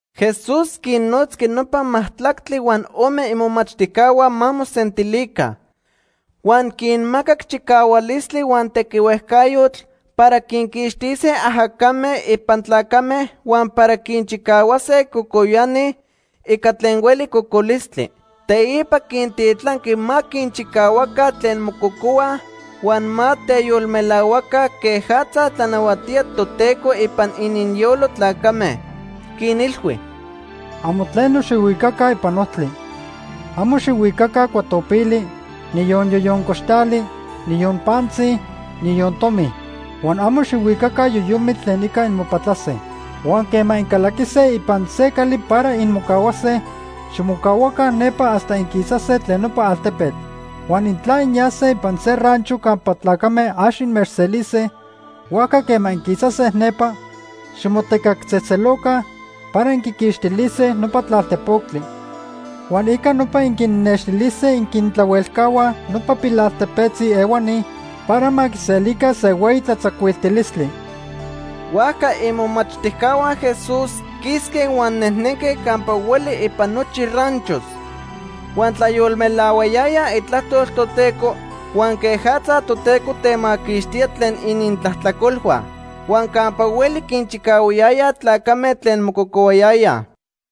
Jesús quinnotzqui nopa majtlactli huan ome imomachtijcahua ma mosentilica. Huan quinmacac chicahualistli huan tequihuejcayotl para quinquixtise ajacame ipan tlacame huan para quinchicahuase cocoyani ica tlen hueli cocolistli. Teipa quintitlanqui ma quinchicahuaca tlen mococohuaj huan ma teyolmelahuacaj quejatza tlanahuatía Toteco ipan ininyolo tlacame. Quinilhui: ―Amo tleno xijhuicaca ipan ojtli. Amo xijhuicaca cuatopili, niyon yoyoncoxtali, niyon pantzi, niyon tomi. Huan amo xijhuicaca yoyomitl tlen ica inmopatlase. Huan quema incalaquise ipan se cali para inmocahuase, ximocahuaca nepa hasta inquisase tlen nopa altepetl. Huan intla inyase ipan se rancho campa tlacame ax inmechselise, huajca quema inquisase nepa, ximotecactzejtzeloca para inquiquixtilise nopa tlalpotectli. Huan ica nopa inquinnextilise inquintlahuelcahuaj nopa pilaltepetzi ehuani para ma quiselica se hueyi tlatzacuiltilistli. Huajca imomachtijcahua Jesús quisque huan nejnenque campa hueli ipan nochi ranchos. Huan tlayolmelahuayayaj itlajtol Toteco huan quejatza Toteco temaquixtía tlen inintlajtlacolhua. Huan campa hueli quinchicahuayayaj tlacame tlen mococohuayayaj.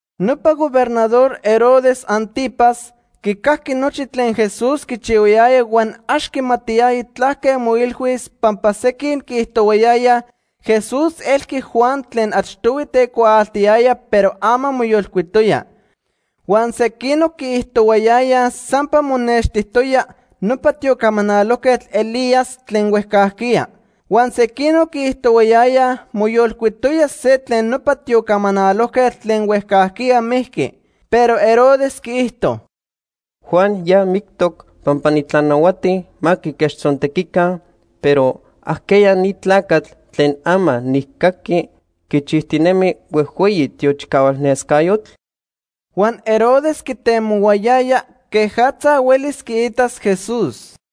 Nopa Gobernador Herodes Ántipas quicajqui nochi tlen Jesús quichihuayaya huan ax quimatiyaya tlaque moilhuis pampa sequin quiijtohuayayaj Jesús elqui Juan tlen achtohui tecuaaltiyaya pero ama moyolcuitoya. Huan sequinoc quiijtohuayayaj sampa monextijtoya nopa tiocamalojquetl Elías tlen huejcajquiya. Huan sequinoc quiijtohuayayaj moyolcuitoya se tlen nopa tiocamanalojquetl tlen huejcajquiya mijqui. Pero Herodes quiijto: ―Juan ya mictoc pampa nitlanahuati ma quiquechtzontequica, pero ¿ajqueya ni tlacatl tlen ama nijcaqui quichijtinemi huejhueyi tiochicahual nescayotl? Huan Herodes quitemohuayaya quejatza huelis quiitas Jesús.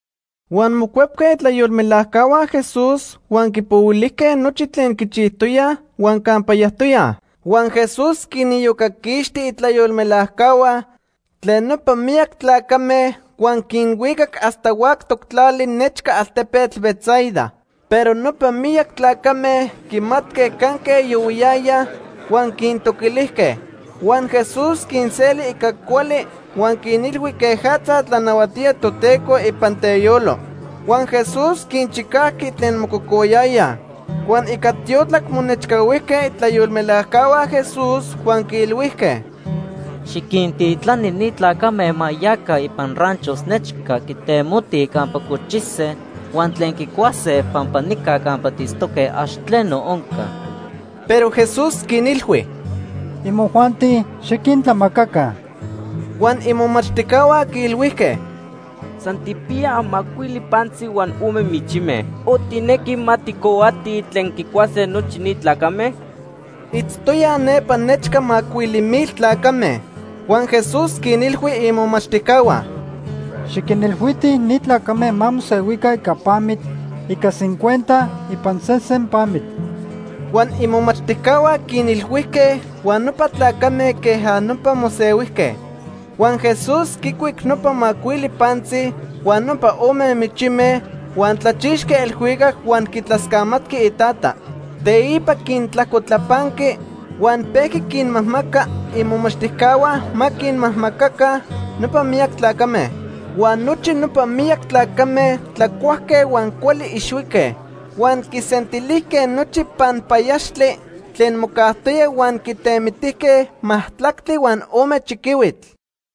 Huan mocuepque itlayolmelajcahua Jesús huan quipohuilijque nochi tlen quichijtoyaj huan campa yajtoyaj. Huan Jesús quiniyocaquixti itlayolmelajcahua tlen nopa miyac tlacame huan quinhuicac hasta huactoc tlali nechca altepetl Betsaida. Pero nopa miyac tlacame quimatque canque yohuiyayaj huan quintoquilijque. Huan Jesús quinseli ica cuali huan quinilhui quejatza tlanahuatía Toteco ipan teyolo. Huan Jesús quinchicajqui tlen mococohuayayaj. Huan ica tiotlac monechcahuijque itlayolmelajcahua Jesús huan quiilhuijque: ―Xiquintitlani ni tlacame ma yaca ipan ranchos nechca quitemotij campa cochise huan tlen quicuase pampa nica campa tiitztoque ax tleno onca. Pero Jesús quinilhui: ―Imojuanti xiquintlamacaca. Huan imomachtijcahua quiilhuijque: ―San tijpiyaj macuili pantzi huan ome michime, o ¿tijnequi ma tijcohuatij tlen quicuase nochi ni tlacame? Itztoyaj nepa nechca macuili mil tlacame. Huan Jesús quinilhui imomachtijcahua: ―Xiquinilhuitij ni tlacame ma mosehuica ica pamitl, ica cincuenta ipan sesen pamitl. Huan imomachtijcahua quinilhuijque huan nopa tlacame queja nopa mosehuijque. Huan Jesús quicuic nopa macuili pantzi huan nopa ome michime, huan tlachixqui elhuicac huan quitlascamatqui iTata. Teipa quintlajcotlapanqui huan pejqui quinmajmaca imomachtijcahua ma quinmajmacaca nopa miyac tlacame. Huan nochi nopa miyac tlacame tlacuajque huan cuali ixhuique. Huan quisentilijque nochi panpayaxtli tlen mocajtoya huan quitemitijque majtlactli huan ome chiquihuitl.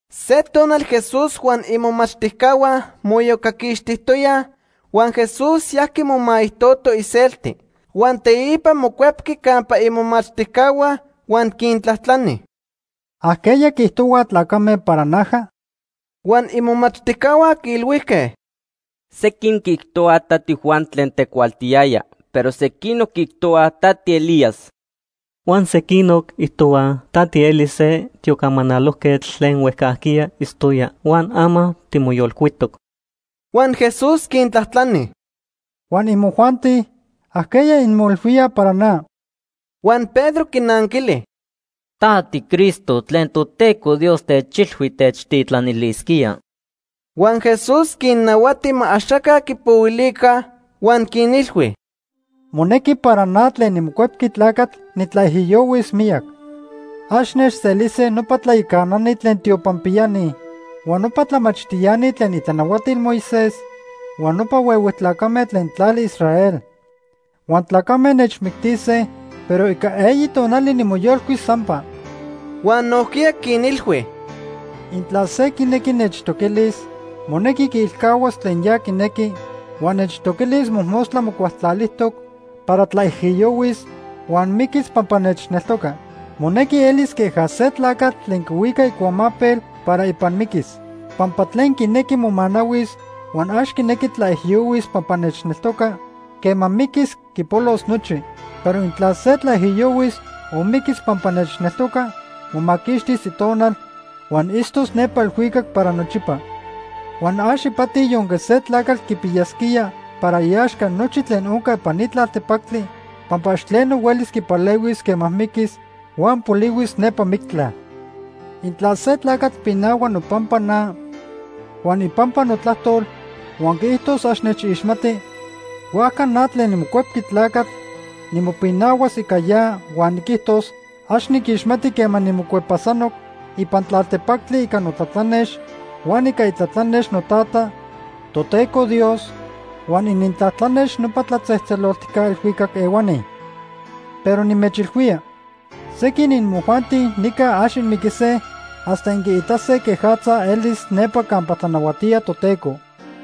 Se tonal Jesús huan imomachtijcahua moiyocaquixtijtoyaj, huan Jesús yajqui momaijtoto iselti. Huan teipa mocuepqui campa imomachtijcahua huan quintlajtlani: ―¿Ajqueya quiijtohuaj tlacame para naja? Huan imomachtijcahua quiilhuijque: ―Sequin quiijtohuaj ta tiJuan tlen tecuaaltiyaya, pero sequinoc quiijtohuaj ta tiElías. Huan sequinoc quiijtohuaj ta tieli se tiocamanalojquetl tlen huejcajquiya itztoya huan ama timoyolcuitoc. Huan Jesús quintlajtlani: ―Huan, ¿imojuanti? ¿Ajqueya inmoilhuíaj para na? Huan Pedro quinanquili: ―Ta tiCristo tlen Toteco Dios techilhui techtitlanilisquía. Huan Jesús quinnahuati ma axaca quipohuilica, huan quinilhui: ―Monequi para na tlen niMocuepqui Tlacatl nitlaijiyohuis miyac. Ax nechselise nopa tlayacanani tlen tiopanpiyani, huan nopa tlamachtiani tlen itlanahuatil Moisés huan nopa huehue tlacame tlen tlali Israel. Huan tlacame nechmictise, pero ica eyi tonali nimoyolcuis sampa. Huan nojquiya quinilhui: ―Intla se quinequi nechtoquilis, monequi quiilcahuas tlen ya quinequi huan nechtoquilis mojmostla mocualtlalijtoc para tlaijiyohuis huan miquis pampa nechneltoca. Monequi elis queja se tlacatl tlen quihuica icuamapel para ipan miquis. Pampa tlen quinequi momanahuis huan ax quinequi tlaijiyohuis pampa nechneltoca, quema miquis quipolos nochi. Pero intla se tlaijiyohuis o miquis pampa nechneltoca, momaquixtis itonal huan itztos nepa elhuicac para nochipa. Huan ax ipati yonque se tlacatl quipiyasquía para iaxca nochi tlen onca ipan ni tlaltepactli, pampa ax tleno huelis quipalehuis quema miquis huan polihuis nepa mictla. Intla se tlacatl pinahua nopampa na huan ipampa notlajtol huan quiijtos ax nechixmati, huajca na tlen niMocuepqui Tlacatl nimopinahuas ica ya huan niquijtos ax niquixmati quema nimocuepasanoc ipan tlaltepactli ica notlatlanex huan ica itlatlanex noTata, Toteco Dios huan inintlatlanex nopa tlatzejtzeloltijca elhuicac ehuani. Pero nimechilhuía, sequin imojuanti nica ax inmiquise hasta inquiitase quejatza elis nepa campa tlanahuatía Toteco.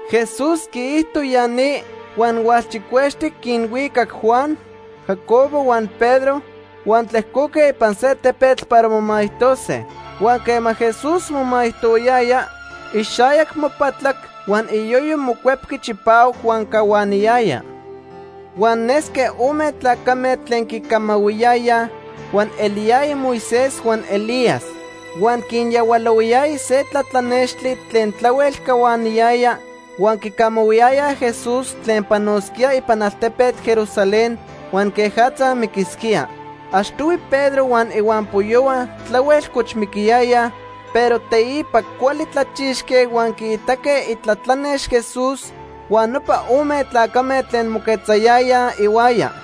Jesús quiijto ya ni huan hualchicuextic quinhuicac Juan, Jacobo huan Pedro huan tlejcoque ipan se tepetl para momaijtose. Huan quema Jesús momaijtohuayaya, ixayac mopatlac huan iyoyo mocuepqui chipahuac huan cahuaniyaya. Huan nesque ome tlacame tlen quicamahuiyayaj, huan eliyayaj Moisés huan Elías. Huan quinyahualohuayaya se tlatlanextli tlen tlahuel cahuaniyaya, huan quicamahuiyayaj Jesús tlen panosquía ipan altepetl Jerusalén huan quejatza miquisquía. Achtohui Pedro huan ihuampoyohua tlahuel cochmiquiyayaj, pero teipa cuali tlachixque huan quiitaque itlatlanex Jesús huan nopa ome tlacame tlen moquetzayayaj ihuaya.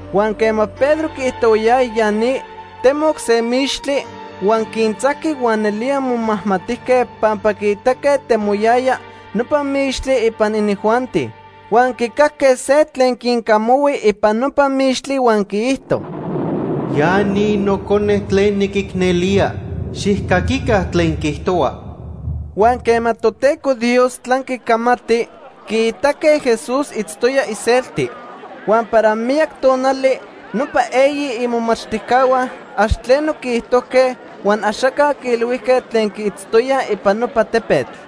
Huan quema Pedro quiijtohuayaya ya ni, temoc se mixtli, huan quintzajqui huan nelía momajmatijque pampa quiitaque temoyaya nopa mixtli ipan inijuanti. Huan quicajque se tlen quincamahui ipan nopa mixtli huan quiijto: “Ya ni Nocone tlen niquicnelía. Xijcaquica tlen quiijtohua.” Huan quema Toteco Dios tlanqui camati, quiitaque Jesús itztoya iselti. Huan para miyac tonali nopa eyi imomachtijcahua ax tleno quiijtojque huan axaca quiilhuijque tlen quiitztoyaj ipan nopa tepetl.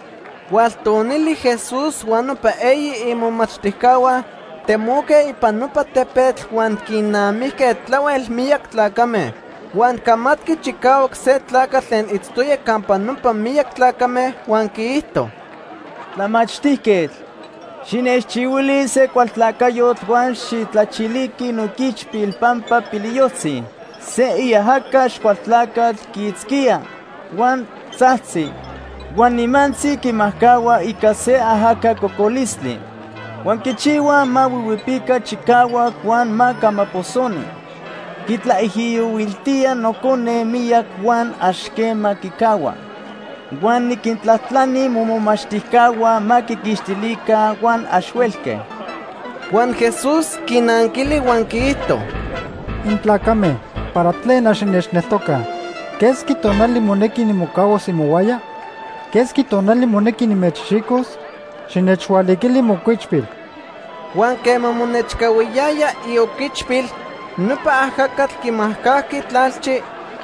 Hualtonili Jesús huan nopa eyi imomachtijcahua temoque ipan nopa tepetl huan quinnamijque tlahuel miyac tlacame. Huan camatqui chicahuac se tlacatl tlen itztoya campa nopa miyac tlacame huan quiijto: ―Tlamachtijquetl, xinechchihuili se cualtlacayotl huan xijtlachiliqui nooquichpil pampa piliyojtzi. Se iajaca Axcualtlacatl quiitzquía, huan tzajtzi, huan nimantzi quimajcahua ica se ajaca cocolistli. Huan quichihua ma huihuipica chicahuac huan ma camaposoni. Quitlaijiyohuiltía nocone miyac huan ax quema quicahua. Huan niquintlajtlani momomachtijcahua ma quiquixtilica huan ax huelque. Huan Jesús quinanquili huan quiijto: ―¡Intlacame para tlen ax innechneltocaj! ¿Quesqui tonali monequi nimocahuas imohuaya? ¿Quesqui tonali monequi nimechxicos? Xinechhualiquili mooquichpil. Huan quema monechcahuiyaya ioquichpil, nopa ajacatl quimajcajqui tlalchi,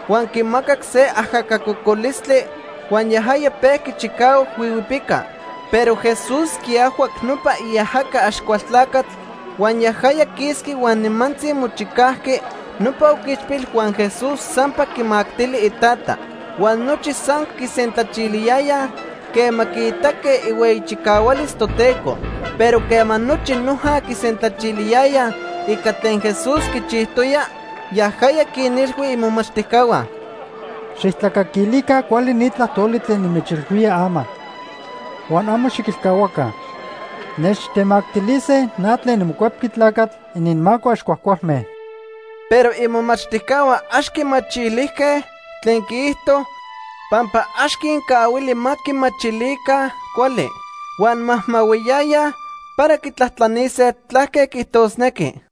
huan quimacac se ajaca cocolistli huan yajaya pejqui chicahuac huihuipica. Pero Jesús quiajhuac nopa iajaca Axcualtlacatl huan yajaya quisqui huan nimantzi mochicajqui nopa oquichpil huan Jesús sampa quimactili itata. Huan nochi san quisentlachiliyayaj quema quiitaque ihueyi chicahualis Toteco. Pero quema nochi noja quisentlachiliyayaj ica tlen Jesús quichijtoya, yajaya quinilhui imomachtijcahua: ―Xijtlacaquilica cuali ni tlajtoli tlen nimechilhuía ama huan amo xiquilcahuaca. Nechtemactilise na tlen niMocuepqui Tlacatl ininmaco ax cuajcualme. Pero imomachtijcahua ax quimachilijque tlen quiijto pampa ax quincahuili ma quimachilica cuali. Huan majmahuiyayaj para quitlajtlanise tlaque quiijtosnequi.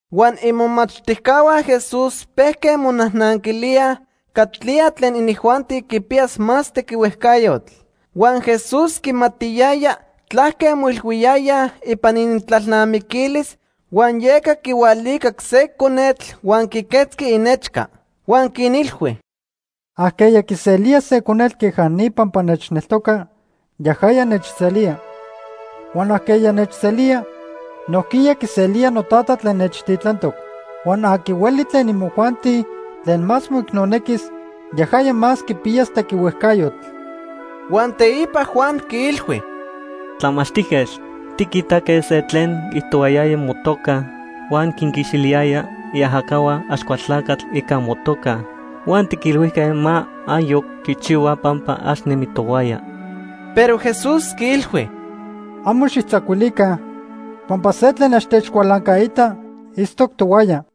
Huan imomachtijcahua Jesús pejque monajnanquilíaj catlía tlen inijuanti quipiyas más tequihuejcayotl. Huan Jesús quimatiyaya tlaque moilhuiyayaj ipan inintlalnamiquilis, huan yeca quihualicac se conetl huan quiquetzqui inechca. Huan quinilhui: ―Ajqueya quiselía se conetl queja ni pampa nechneltoca, yajaya nechselía. Huan ajqueya nechselía, nojquiya quiselía noTata tlen nechtitlantoc. Huan aqui hueli tlen imojuanti tlen más moicnonequis, yajaya más quipiyas tequihuejcayotl. Huan teipa Juan quiilhui: ―Tlamachtijquetl, tiquitaque se tlen quiijtohuayaya motoca huan quinquixtiliyaya iajacahua Axcualtlacatl ica motoca, huan tiquilhuijque ma ayoc quichihua pampa ax nemi tohuaya. Pero Jesús quiilhui: ―Amo xijtzacuilica pampa se tlen ax techcualancaita itztoc tohuaya.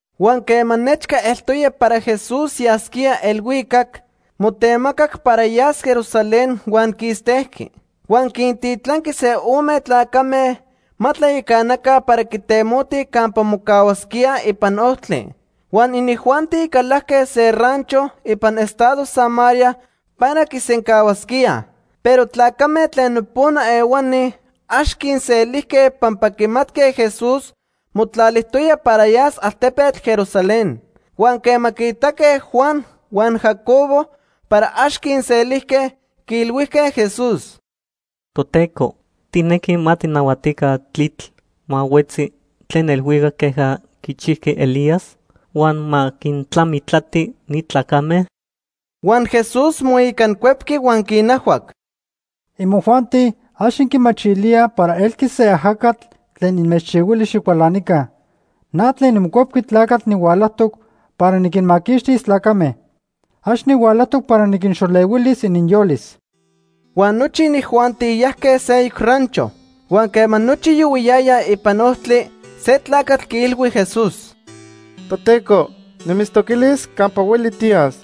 Huan quema nechca eltoya para Jesús yasquía elhuicac, motemacac para yas Jerusalén huan quistejqui. Huan quintitlanqui se ome tlacame ma tlayacanaca para quitemotij campa mocahuasquíaj ipan ojtli. Huan inijuanti calajque se rancho ipan estado Samaría para quisencahuasquíaj. Pero tlacame tlen nopona ehuani ax quinselijque pampa quimatque Jesús motlalijtoya para yas altepetl Jerusalén. Huan quema quiitaque Juan huan Jacobo para ax quinselijque, quiilhuijque Jesús: ―Toteco, ¿tijnequi ma tijnahuatica tlitl ma huetzi tlen elhuicac queja quichijqui Elías huan ma quintlamitlati ni tlacame? Huan Jesús moicancuepqui huan quinajhuac: ―Imojuanti ax inquimachilíaj para elqui se ajacatl tlen inmechchihuili xicualanica. Na tlen niMocuepqui Tlacatl nihualajtoc para niquinmaquixtis tlacame. Ax nihualajtoc para niquinxolehuilis ininyolis. Huan nochi inijuanti yajque seyoc rancho. Huan quema nochi yohuiyayaj ipan ojtli, se tlacatl quiilhui Jesús: ―Toteco, nimitztoquilis campa hueli tiyas.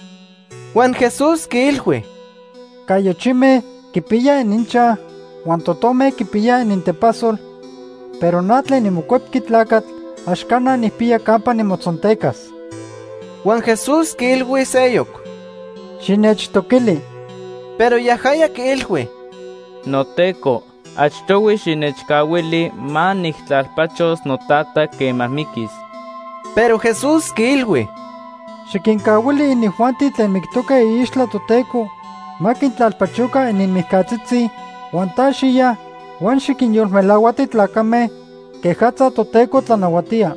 Huan Jesús quiilhui: ―Cayochime quipiyaj ininchaj huan totome quipiyaj inintepasol, pero na tlen niMocuepqui Tlacatl ax cana nijpiya campa nimotzontecas. Huan Jesús quiilhui seyoc: ―Xinechtoquili. Pero yajaya quiilhui: ―NoTeco, achtohui xinechcahuili ma nijtlalpachos notata quema miquis. Pero Jesús quiilhui: ―Xiquincahuili inijuanti tlen mictoque iixtla Toteco ma quintlalpachoca ininmijcatzitzi, huan ta xiya huan xiquinyolmelahuati tlacame quejatza Toteco tlanahuatía.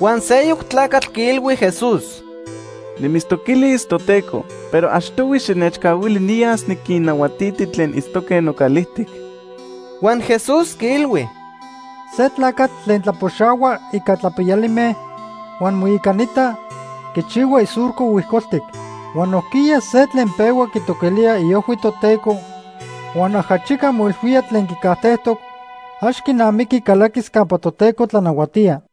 Huan seyoc tlacatl quiilhui Jesús: ―Nimitztoquilis, noTeco, pero achtohui xinechcahuili niyas niquinnahuatiti tlen itztoque nocalijtic. Huan Jesús quiilhui: ―Se tlacatl tlen tlapoxahua ica tlapiyalime huan moicanita quichihua isurco huijcoltic. Huan nojquiya se tlen pehua quitoquilía iojhui Toteco huan ajachica moilhuía tlen quicajtejtoc, ax quinamiqui calaquis campa Toteco tlanahuatía.